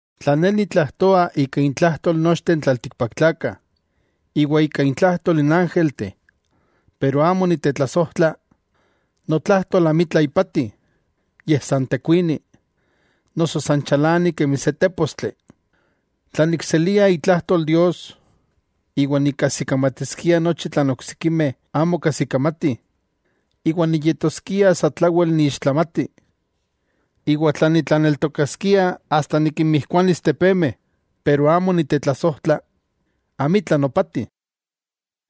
Tla ne nitlajtoa ika intlajtol nochteh n tlaltikpaktlakah iwa ika intlajtol n ángelteh, pero amo nitetlasojtla, notlajtol amitla ipati, yej san tekuini, noso san chalani kemi se tépostli. Tla nikselia itlajtol Dios, iwa nikajsikamatiskia nochi tlan oksikimeh amo kajsikamatih, iwa niyetoskia satlawel niixtlamati, iwa tla nitlaneltokaskia asta nikinmijkuanis tepemeh, pero amo nitetlasojtla, amitla nopati.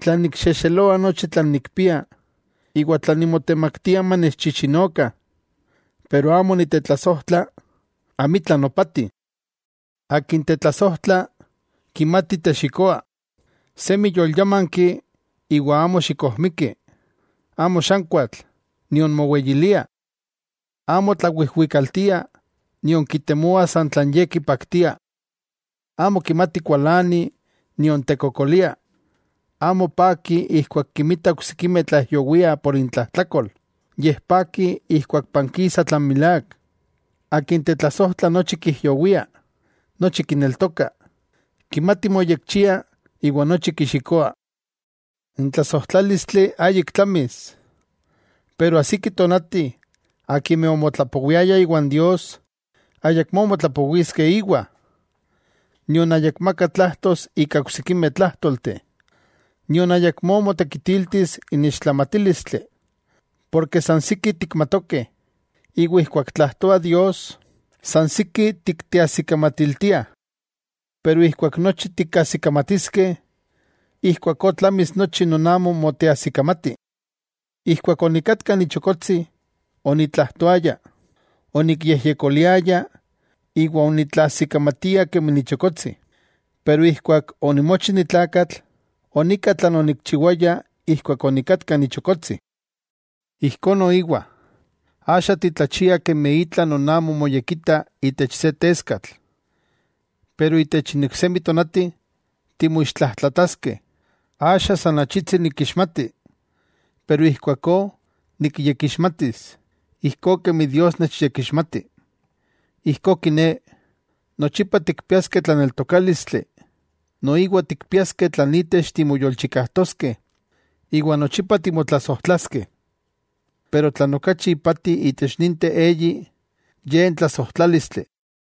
Tla nikxejxeloa nochi tlan nikpia, iwa tla nimotemaktia manechchichinokah, pero amo nitetlasojtla, amitla nopati. Akin tetlasojtla, kimati texikoa; semi yolyámanki iwa amo xikojmiki; amo xankuatl nion moweyilia. Amo tlawijwikaltia nion kitemoa san tlan ye kipaktia; amo kimati kualani nion tekokolia. Amo paki ijkuak kinmita oksikimeh tlaijyowiah por intlajtlakol, yej paki ijkuak pankisa tlan milák. Akin tetlasojtla nochi kijyowia, nochi kineltoka, kimati moyekchia iwa nochi kixikoa. N tlasojtlálistli ayik tlamis. Pero ajsiki tonati akimeh omotlapowiaya iwan Dios ayakmó motlapowiskeh íwa, nion ayakmakah tlajtos ika oksikimeh tlájtolteh, nion ayakmó motekitiltis n ixtlamatílistli. Porke san siki tikmatokeh, iwa ijkuak tlajtoa Dios, san siki tikteajsikamatiltiah. Pero ijkuak nochi tikajsikamatiskeh, ijkuakó tlamis nochi non amo moteajsikamati. Ijkuak onikatka ni chokotsi, onitlajtoaya, onikyejyekoliaya iwa onitlaajsikamatia kemi nichokotsi. Pero ijkuak onimochi nitlakatl, onika tlan onikchiwaya ijkuak onikatka nichokotsi. Ijkó noiwa, axa titlachiah kemi itla non amo moyekita itech se teskatl. Pero itech n iksemi tonati, timoixtlajtlataskeh. Axa san achitsi nikixmati, pero ijkuakó nikyekixmatis, ijkó kemi Dios nechyekixmati. Ijkó kiné, nochipa tikpiaskeh tlaneltokálistli, noiwa tikpiaskeh tlan itech timoyolchikajtoskeh iwa nochipa timotlasojtlaskeh. Pero tlan okachi ipati itech ninteh eyi, ye n tlasojtlálistli.